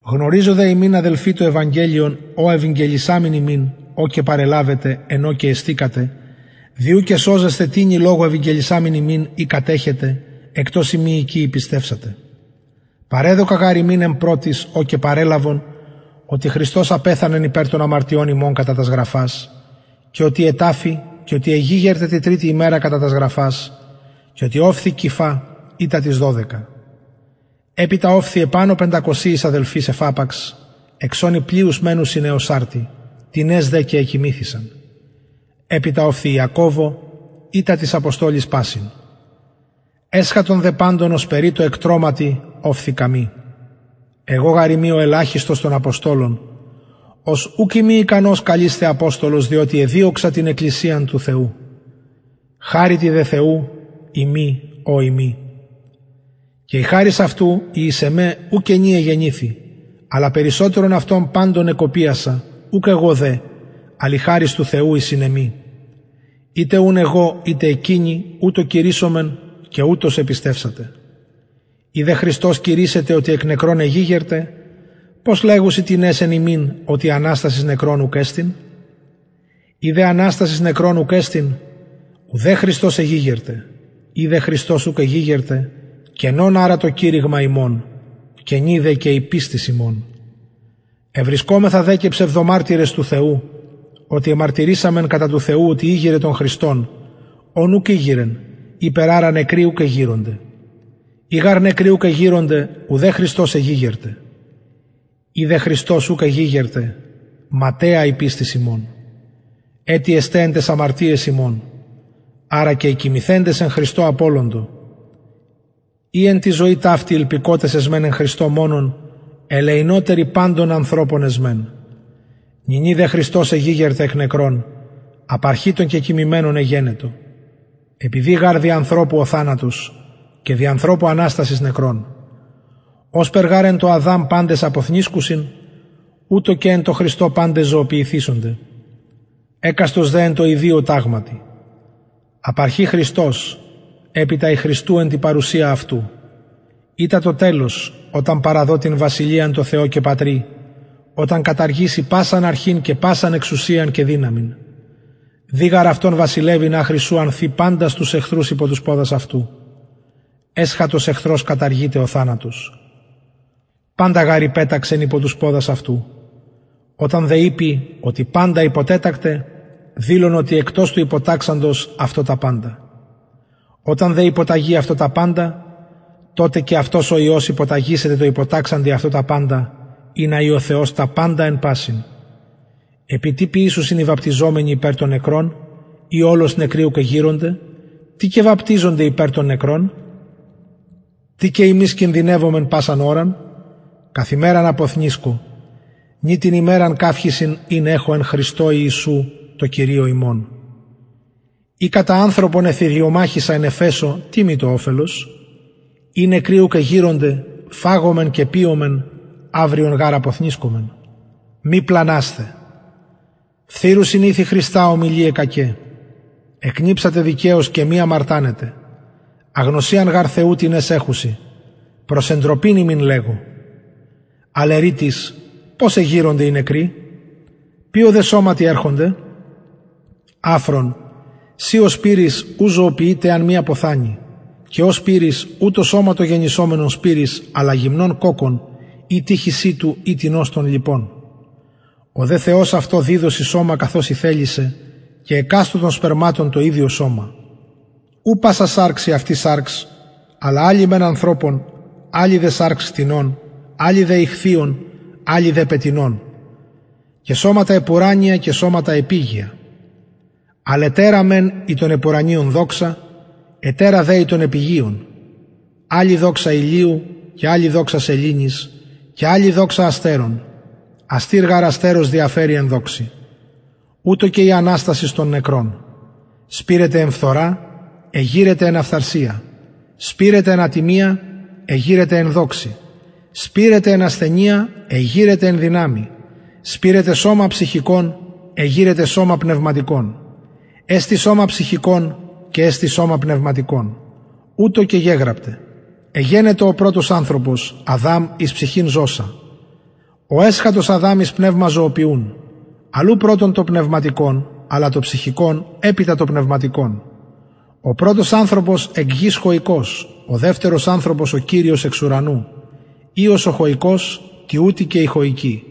γνωριζω δε υμιν αδελφοι το ευαγγελιον ο ευηγγελισαμην υμιν ο και παρελαβετε εν ω και εστηκατε δι ου και σωζεσθε τινι λογω ευηγγελισαμην υμιν ει κατεχετε εκτος ει μη εικη επιστευσατε παρεδωκα γαρ υμιν εν πρωτοις ο και παρελαβον οτι χριστος απεθανεν υπερ των αμαρτιων ημων κατα τας γραφας και οτι εταφη και οτι εγηγερται τη τριτη ημερα κατα τας γραφας και οτι ωφθη κηφα ειτα τοις δωδεκα επειτα ωφθη επανω πεντακοσιοις αδελφοις εφαπαξ εξ ων οι πλειους μενουσιν εως αρτι τινες δε και εκοιμηθησαν επειτα ωφθη ιακωβω ειτα τοις αποστολοις πασιν εσχατον δε παντων ωσπερει τω εκτρωματι ωφθη καμοι εγω γαρ ειμι ο ελαχιστος των αποστολων ος ουκ ειμι ικανος καλεισθαι αποστολος διοτι εδιωξα την εκκλησιαν του θεου χαριτι δε θεου ειμι ο ειμι και η χαρις αυτου η εις εμε ου κενη εγενηθη αλλα περισσοτερον αυτων παντων εκοπιασα ουκ εγω δε αλλ η χαρις του θεου η συν εμοι ειτε ουν εγω ειτε εκεινοι ουτως κηρυσσομεν και ουτως επιστευσατε ει δε χριστος κηρυσσεται οτι εκ νεκρων εγηγερται πως λεγουσιν τινες εν υμιν οτι αναστασις νεκρων ουκ εστιν ει δε αναστασις νεκρων ουκ εστιν ουδε χριστος εγηγερται ει δε χριστος ουκ εγηγερται κενον αρα το κηρυγμα ημων κενη δε και η πιστις υμων ευρισκομεθα δε και ψευδομαρτυρες του θεου οτι εμαρτυρησαμεν κατα του θεου οτι ηγειρεν τον χριστον ον ουκ ηγειρεν ειπερ αρα νεκροι ουκ εγειρονται ει γαρ νεκροι ουκ εγειρονται ουδε χριστος εγηγερται ει δε χριστος ουκ εγηγερται ματαια η πιστις υμων ετι εστε εν ταις αμαρτιαις υμων αρα και οι κοιμηθεντες εν χριστω απωλοντο ει εν τη ζωη ταυτη ηλπικοτες εσμεν εν χριστω μονον ελεεινοτεροι παντων ανθρωπων εσμεν νυνι δε χριστος εγηγερται εκ νεκρων απαρχη των κεκοιμημενων εγενετο επειδη γαρ δι ανθρωπου ο θανατος και δι ανθρωπου αναστασις νεκρων ωσπερ γαρ εν τω αδαμ παντες αποθνησκουσιν ουτως και εν τω χριστω παντες ζωοποιηθησονται εκαστος δε εν τω ιδιω ταγματι απαρχη χριστος επειτα οι του χριστου εν τη παρουσια αυτου ειτα το τελος οταν παραδω την βασιλειαν τω θεω και πατρι οταν καταργηση πασαν αρχην και πασαν εξουσιαν και δυναμιν δει γαρ αυτον βασιλευειν αχρι ου αν θη παντας τους εχθρους υπο τους ποδας αυτου εσχατος εχθρος καταργειται ο θανατος παντα γαρ υπεταξεν υπο τους ποδας αυτου οταν δε ειπη οτι παντα υποτετακται δηλον οτι εκτος του υποταξαντος αυτω τα παντα οταν δε υποταγη αυτω τα παντα τοτε και αυτος ο υιος υποταγησεται τω υποταξαντι αυτω τα παντα ινα η ο θεος τα παντα εν πασιν επει τι ποιησουσιν οι βαπτιζομενοι υπερ των νεκρων ει ολως νεκροι ουκ εγειρονται τι και βαπτιζονται υπερ των νεκρων τι και ημεις κινδυνευομεν πασαν ωραν καθ ημεραν αποθνησκω νη την υμετεραν καυχησιν ην εχω εν χριστω ιησου τω κυριω ημων ει κατα ανθρωπον εθηριομαχησα εν εφεσω τι μοι το οφελος ει νεκροι ουκ εγειρονται φαγωμεν και πιωμεν αυριον γαρ αποθνησκομεν μη πλανασθε φθειρουσιν ηθη χρηστα ομιλιαι κακαι εκνηψατε δικαιως και μη αμαρτανετε αγνωσιαν γαρ θεου τινες εχουσιν προς εντροπην υμιν λεγω αλλ ερει τις πως εγειρονται οι νεκροι ποιω δε σωματι ερχονται αφρον συ ο σπειρεις ου ζωοποιειται εαν μη αποθανη και ο σπειρεις ου το σωμα το γενησομενον σπειρεις αλλα γυμνον κοκκον ει τυχοι σιτου η τινος των λοιπων ο δε θεος αυτω διδωσιν σωμα καθως ηθελησεν και εκαστω των σπερματων το ιδιον σωμα ου πασα σαρξ η αυτη σαρξ αλλα αλλη μεν ανθρωπων αλλη δε σαρξ κτηνων αλλη δε ιχθυων αλλη δε πτηνων και σωματα επουρανια και σωματα επιγεια αλλ ετερα μεν η των επουρανιων δοξα ετερα δε η των επιγειων αλλη δοξα ηλιου και αλλη δοξα σεληνης και αλλη δοξα αστερων αστηρ γαρ αστερος διαφερει εν δοξη ουτως και η αναστασις των νεκρων σπειρεται εν φθορα εγειρεται εν αφθαρσια σπειρεται εν ατιμια εγειρεται εν δοξη σπειρεται εν ασθενεια εγειρεται εν δυναμει σπειρεται σωμα ψυχικον εγειρεται σωμα πνευματικον εστιν σωμα ψυχικον και εστιν σωμα πνευματικον ουτως και γεγραπται εγενετο ο πρωτος ανθρωπος αδαμ εις ψυχην ζωσαν ο εσχατος αδαμ εις πνευμα ζωοποιουν αλλ ου πρωτον το πνευματικον αλλα το ψυχικον επειτα το πνευματικον ο πρωτος ανθρωπος εκ γης χοικος ο δευτερος ανθρωπος ο κυριος εξ ουρανου οιος ο χοικος τοιουτοι και οι χοικοι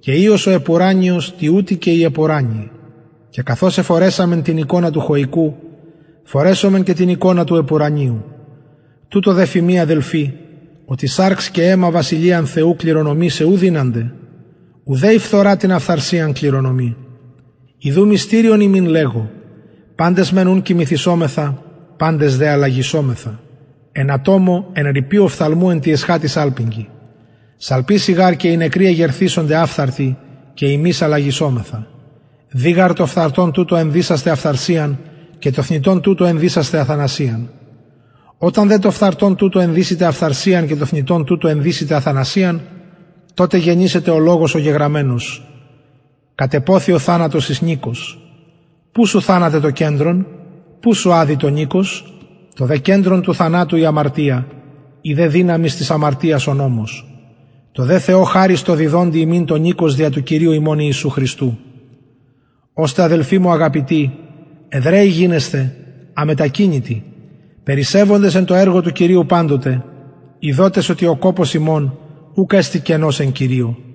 και οιος ο επουρανιος τοιουτοι και οι επουρανιοι και καθως εφορεσαμεν την εικονα του χοικου φορεσωμεν και την εικονα του επουρανιου τουτο δε φημι αδελφοι οτι σαρξ και αιμα βασιλειαν θεου κληρονομησαι ου δυνανται ουδε η φθορα την αφθαρσιαν κληρονομει ιδου μυστηριον υμιν λεγω παντες μεν ου κοιμηθησομεθα παντες δε αλλαγησομεθα εν ατομω εν ριπη οφθαλμου εν τη εσχατη σαλπιγγι σαλπισει γαρ και οι νεκροι εγερθησονται αφθαρτοι και ημεις αλλαγησομεθα δει γαρ το φθαρτον τουτο ενδυσασθαι αφθαρσιαν και το θνητον τουτο ενδυσασθαι αθανασιαν οταν δε το φθαρτον τουτο ενδυσηται αφθαρσιαν και το θνητον τουτο ενδυσηται αθανασιαν τοτε γενησεται ο λογος ο γεγραμμενος κατεποθη ο θανατος εις νικος που σου θανατε το κεντρον που σου αδη το νικος το δε κεντρον του θανατου η αμαρτια η δε δυναμις της αμαρτιας ο νομος τω δε θεω χαρις τω διδοντι ημιν το νικος δια του κυριου ημων ιησου χριστου ωστε αδελφοι μου αγαπητοι εδραιοι γινεσθε αμετακινητοι περισσευοντες εν τω εργω του κυριου παντοτε ειδοτες οτι ο κοπος υμων ουκ εστιν κενος εν κυριω